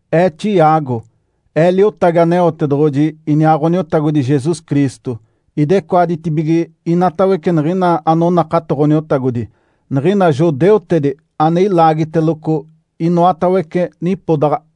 Ee, Tiago, ee liotagi Aneotedoɡ̶oji iniaa Ǥoniotagodi Jesus Cristo. Idecoaditibige inatawece niɡ̶ina anonakato Ǥoniotagodi, niɡ̶ina judeutedi ane ilaagiteloco inoatawece nipodaɡ̶a.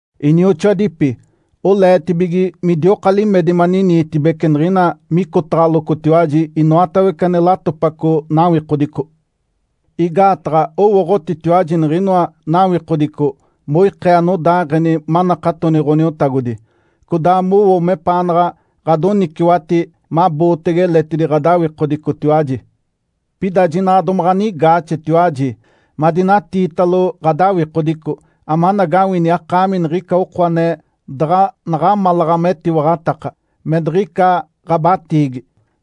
Inioxoadipi, oleetibige midioka limedi maniniitibece niɡ̶ina micotaɡ̶alocotiwaji inoatawece ane latopaco nawikodico. Igaataɡ̶a owooɡ̶otitiwaji niɡ̶inoa nawikodico moikee anodaaɡ̶eni manakatoni Ǥoniotagodi, codaa mowo mepaanaɡ̶a ɡ̶adoniciwati mabootege eletidi ɡ̶adawikodicotiwaji. Pida jinaɡ̶a domaɡ̶a anigaaxetiwaji madinatiitalo ɡ̶adawikodico amanagawini akaami niɡ̶ica oko ane daɡ̶a naɡ̶amalaɡ̶a metiwaɡ̶ataka, me diɡ̶ica ɡ̶abatiigi,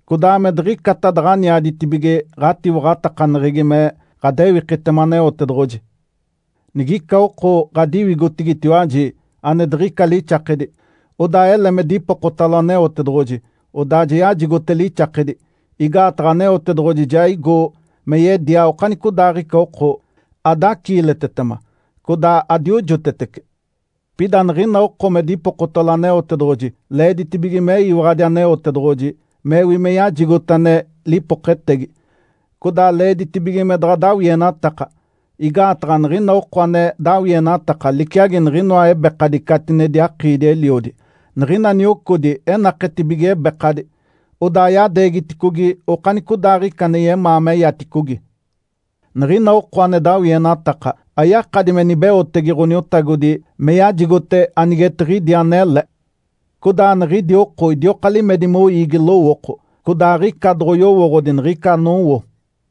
codaa me diɡ̶icata daɡ̶aniaditibige ɡ̶atiwaɡ̶atakaneɡ̶egi me ɡ̶adewikitema Aneotedoɡ̶oji. Nigica oko ɡ̶adiwigotigitiwaji ane diɡ̶ica lixakedi, odaa ele me dipokotalo Aneotedoɡ̶oji, odaa ja yajigote lixakedi. Igaataɡ̶a Aneotedoɡ̶oji ja igo me yedia okanicodaaɡ̶ica oko, adaciiletetema, codaa adiojotetece. Pida niɡ̶ina oko me dipokotalo Aneotedoɡ̶oji leeditibige meyiwaɡ̶adi Aneotedoɡ̶oji mewi me yajigote ane lipoketegi, codaa leeditibige me daɡ̶a dawienataka. Igaataɡ̶a niɡ̶ina oko ane dawienataka liciagi niɡ̶inoa ebekadi catinedi akiidi-eliodi. Niɡ̶ina niocodi enaketedibige ebekadi, odaa yadeegiticogi okanicodaaɡ̶ica ane yemaa meyaticogi. Niɡ̶ina oko ane dawienataka ayakadi me nibeotege Ǥoniotagodi me yajigote anigetiɡ̶idi anele. Codaa niɡ̶idi oko idioka limedi moiigi lowooko, codaa aɡ̶ica doɡ̶oyowooɡ̶odi niɡ̶ica anowo.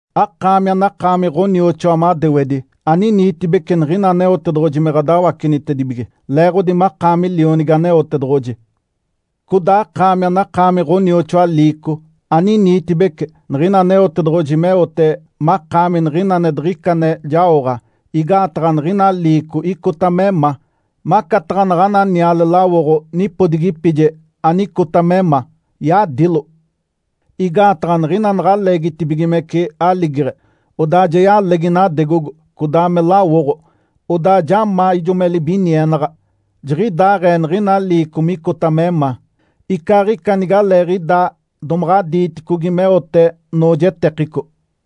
Akaami anakaami ɡ̶onioxoa madewedi, aniniitibece niɡ̶ina Aneotedoɡ̶oji me ɡ̶adawacenitedibige leeɡ̶odi makaami lionigi Aneotedoɡ̶oji. Codaa akaami anakaami ɡ̶onioxoa liico, aniniitibece niɡ̶ina Aneotedoɡ̶oji meote makaami niɡ̶ina ane diɡ̶ica ane jaoɡ̶a, igaataɡ̶a niɡ̶ina liico icota me ma, macataɡ̶a naɡ̶ana niale lawoɡ̶o nipodigipije anicota me ma, yadilo. Igaataɡ̶a niɡ̶ina naɡ̶a leegitibigimece aligeɡ̶e, odaa ja yalegi nadegogo codaa me lawoɡ̶o, odaa ja ma ijo me libinienaɡ̶a. Jiɡ̶idaaɡ̶ee niɡ̶ina liico micota me ma, icaaɡ̶ica nigaleeɡ̶idaa domaɡ̶a diiticogi meote noojetekico.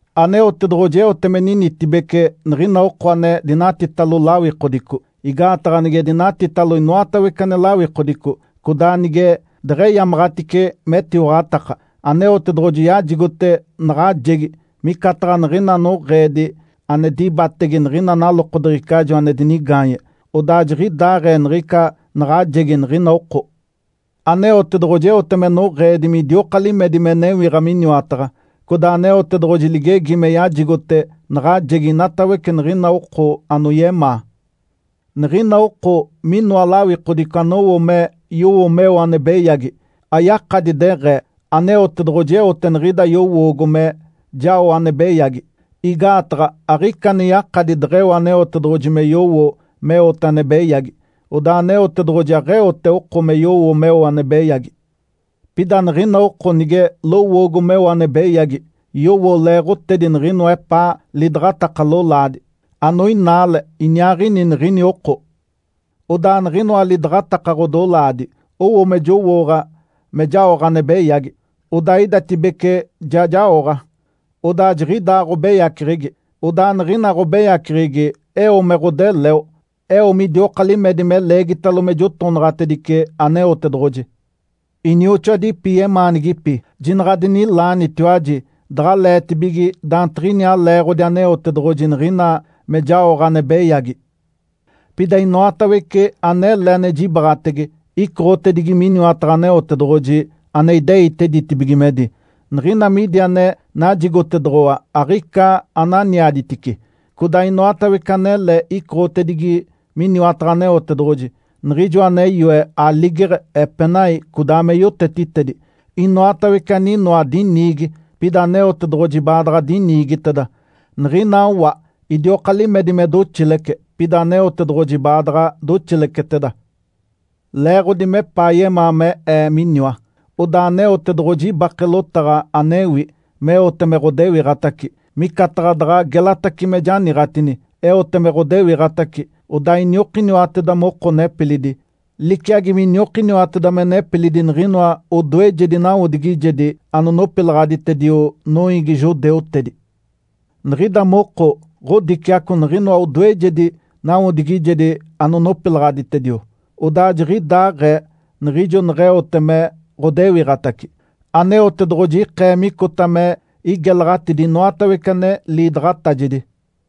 Aneotedoɡ̶oji eote me ninitibece niɡ̶ina oko ane dinatitalo lawikodico. Igaataɡ̶a nige dinatitalo inoatawece ane lawikodico, codaa nige deɡ̶eyamaɡ̶atice metiwaɡ̶ataka, Aneotedoɡ̶oji yajigote naɡ̶ajegi, micataɡ̶a niɡ̶ina noɡ̶eedi ane dibatege niɡ̶ina nalokodeɡ̶ecajo ane dinigaanye. Odaa jiɡ̶idaaɡ̶ee niɡ̶ica naɡ̶ajegi niɡ̶ina oko. Aneotedoɡ̶oji eote me noɡ̶eedi midioka limedi me newiɡ̶a miniwataɡ̶a. Codaa Aneotedoɡ̶oji ligegi me yajigote naɡ̶ajegi inatawece niɡ̶ina oko anoyemaa. Niɡ̶ina oko minoa lawikodico anowo me yowo meo ane beyagi, ayakadi deɡ̶ee, “Aneotedoɡ̶oji eote niɡ̶ida yowoogo me jao ane beyagi.” Igaataɡ̶a aɡ̶ica ane yakadi deɡ̶eo Aneotedoɡ̶oji me yowo meote ane beyagi, odaa Aneotedoɡ̶oji aɡ̶eote oko me yowo meo ane beyagi. Pida niɡ̶ina oko nige lowoogo meo ane beyagi, yowo leeɡ̶otedi niɡ̶inoa epaa lidaɡ̶ataka lolaadi, anoinaale iniaaɡ̶ini niɡ̶ini oko. Odaa niɡ̶inoa lidaɡ̶ataka ɡ̶odolaadi owo me jowooɡ̶a me jaoɡ̶a ane beyagi, odaa idatibece ja jaoɡ̶a, odaa jiɡ̶ida ɡ̶obeyaceɡ̶egi. Odaa niɡ̶ina ɡ̶obeyaceɡ̶egi eo me ɡ̶odeleo, eo midioka limedi me leegitalo me jotonaɡ̶atedice Aneotedoɡ̶oji. Inioxoadipi yemaanigipi! Jinaɡ̶a adininaalenitiwaji daɡ̶aleetibige daantiɡ̶iniaa leeɡ̶odi Aneotedoɡ̶oji niɡ̶ina me jaoɡ̶a ane beyagi. Pida inoatawece anele ane jibaɡ̶atege icoɡ̶otedigi miniwataɡ̶a Aneotedoɡ̶oji ane ideite ditibigimedi. Niɡ̶ina midi ane najigotedoɡ̶owa aɡ̶ica ananiaditice. Codaa inoatawece anele icoɡ̶otedigi miniwataɡ̶a Aneotedoɡ̶oji, Niɡ̶ijoa ane yoe aligeɡ̶e, epenai, codaa me yotetitedi. Inoatawece aninoa diniigi, pida Aneotedoɡ̶oji baadaɡ̶a diniigiteda. Niɡ̶ina wa idioka limedi me doxilece, pida Aneotedoɡ̶oji baadaɡ̶a doxileceteda. Leeɡ̶odi mepaa yemaa me ee miniwa, odaa Aneotedoɡ̶oji ibake lotaɡ̶a, anewi, meote me ɡ̶odewiɡ̶atace, micataɡ̶a daɡ̶a gelatace me janiiɡ̶atini. Eote me ɡ̶odewiɡ̶atace, odaa iniokiniwateda moko nepilidi, liciagi miniokiniwateda me nepilidi niɡ̶inoa odoejedi nawodigijedi anonopilaɡ̶aditedio noiigi judeutedi. Niɡ̶ida moko ɡ̶odiciaco niɡ̶inoa odoejedi nawodigijedi anonopilaɡ̶aditedio, odaa jiɡ̶idaaɡ̶ee niɡ̶ijo neɡ̶eote me ɡ̶odewiɡ̶atace, Aneotedoɡ̶oji ikee micota me igelaɡ̶atidi inoatawece ane liidaɡ̶atajedi.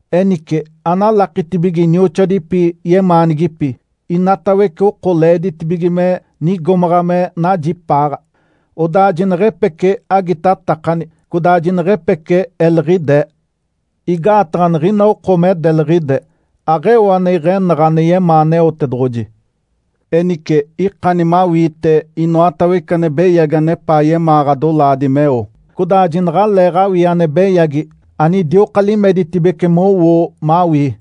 Enice, analakitibige inioxoadipi yemaanigipi! Inatawece oko leeditibige me nigomaɡ̶a me najipaaɡ̶a, odaa jineɡ̶epece agitatakani codaa jineɡ̶epece eliɡ̶idee. Igaataɡ̶a niɡ̶ina oko me deliɡ̶ide, aɡ̶eo ane iɡ̶enaɡ̶a ane yemaa Aneotedoɡ̶oji. Enice, ikani mawiite inoatawece ane beyagi anepaa yemaa ɡ̶adolaadi meo, codaa jinaɡ̶aleeɡ̶awii ane beyagi anidioka limeditibece mowoo mawii.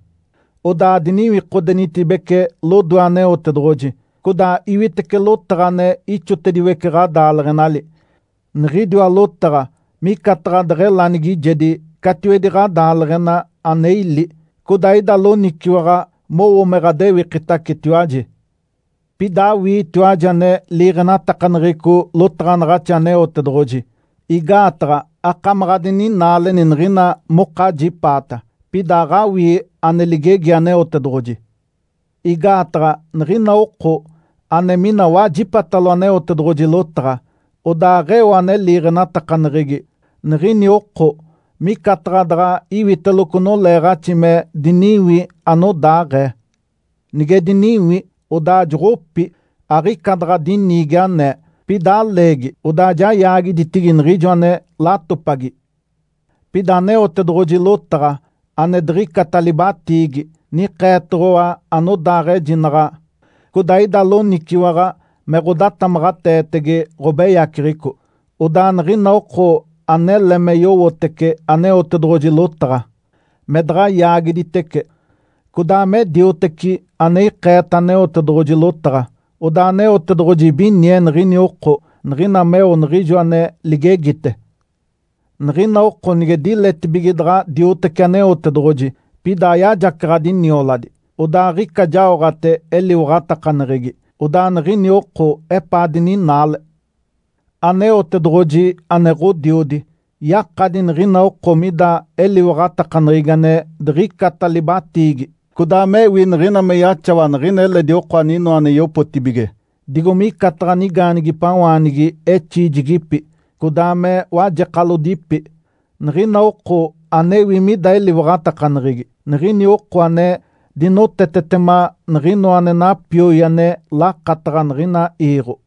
Odaa adiniwikodenitibece lodoe Aneotedoɡ̶oji, codaa iwitece lotaɡ̶a ane ixotediwece ɡ̶adaaleɡ̶enali. Niɡ̶idiwa lotaɡ̶a micataɡ̶a deɡ̶elanigijedi catiwedi ɡ̶adaaleɡ̶ena ane ili, codaa ida loniciwaɡ̶a mowo me ɡ̶adewikitacetiwaji. Pida awiitiwaji ane liiɡ̶enatakaneɡ̶eco lotaɡ̶anaɡ̶axi Aneotedoɡ̶oji. Igaataɡ̶a akamaɡ̶a adininaaleni niɡ̶ina mokajipaata, pida aɡ̶awii ane ligegi Aneotedoɡ̶oji. Igaataɡ̶a niɡ̶ina oko ane mina wajipatalo Aneotedoɡ̶oji lotaɡ̶a, odaa aɡ̶eo ane liiɡ̶enatakaneɡ̶egi, niɡ̶ini oko micataɡ̶a daɡ̶a iwiteloco noleeɡ̶axi me diniwi anodaaɡ̶ee. Nige diniwi, odaa joɡ̶opi, aɡ̶ica daɡ̶a diniigi anee. Pida aleegi, odaa ja yaagiditigi niɡ̶ijo ane latopagi. Pida Aneotedoɡ̶oji lotaɡ̶a, ane diɡ̶icata libatiigi, nikeetoɡ̶owa anodaaɡ̶ejinaɡ̶a, codaa ida loniciwaɡ̶a me ɡ̶odatamaɡ̶ateetege ɡ̶obeyaceɡ̶eco. Odaa niɡ̶ina oko anele me yowotece Aneotedoɡ̶oji lotaɡ̶a, me daɡ̶a yaagiditece, codaa me dioteci ane ikeeta Aneotedoɡ̶oji lotaɡ̶a, odaa Aneotedoɡ̶oji ibinie niɡ̶ini oko niɡ̶ina meo niɡ̶ijo ane ligegite. Niɡ̶ina oko nige diletibige daɡ̶a diotece Aneotedoɡ̶oji, pida ayajacaɡ̶adi nioladi, odaa aɡ̶ica jaoɡ̶ate eliwaɡ̶atakaneɡ̶egi. Odaa niɡ̶ini oko epaa dininaale. Aneotedoɡ̶oji, ane Ǥodiodi, yakadi niɡ̶ina oko mida eliwaɡ̶atakaneɡ̶egi ane diɡ̶icata libatiigi, codaa mewi, niɡ̶ina me yaxawa niɡ̶ina eledi oko aninoa ane yopotibige, digo micataɡ̶a nigaanigipawaanigi exiijigipi, codaa me wajekalodipi. Niɡ̶ina oko anewi mida eliwaɡ̶atakaneɡ̶egi, niɡ̶ini oko ane dinotetetema niɡ̶inoa ane napioi ane lakataɡ̶a niɡ̶ina iiɡ̶o.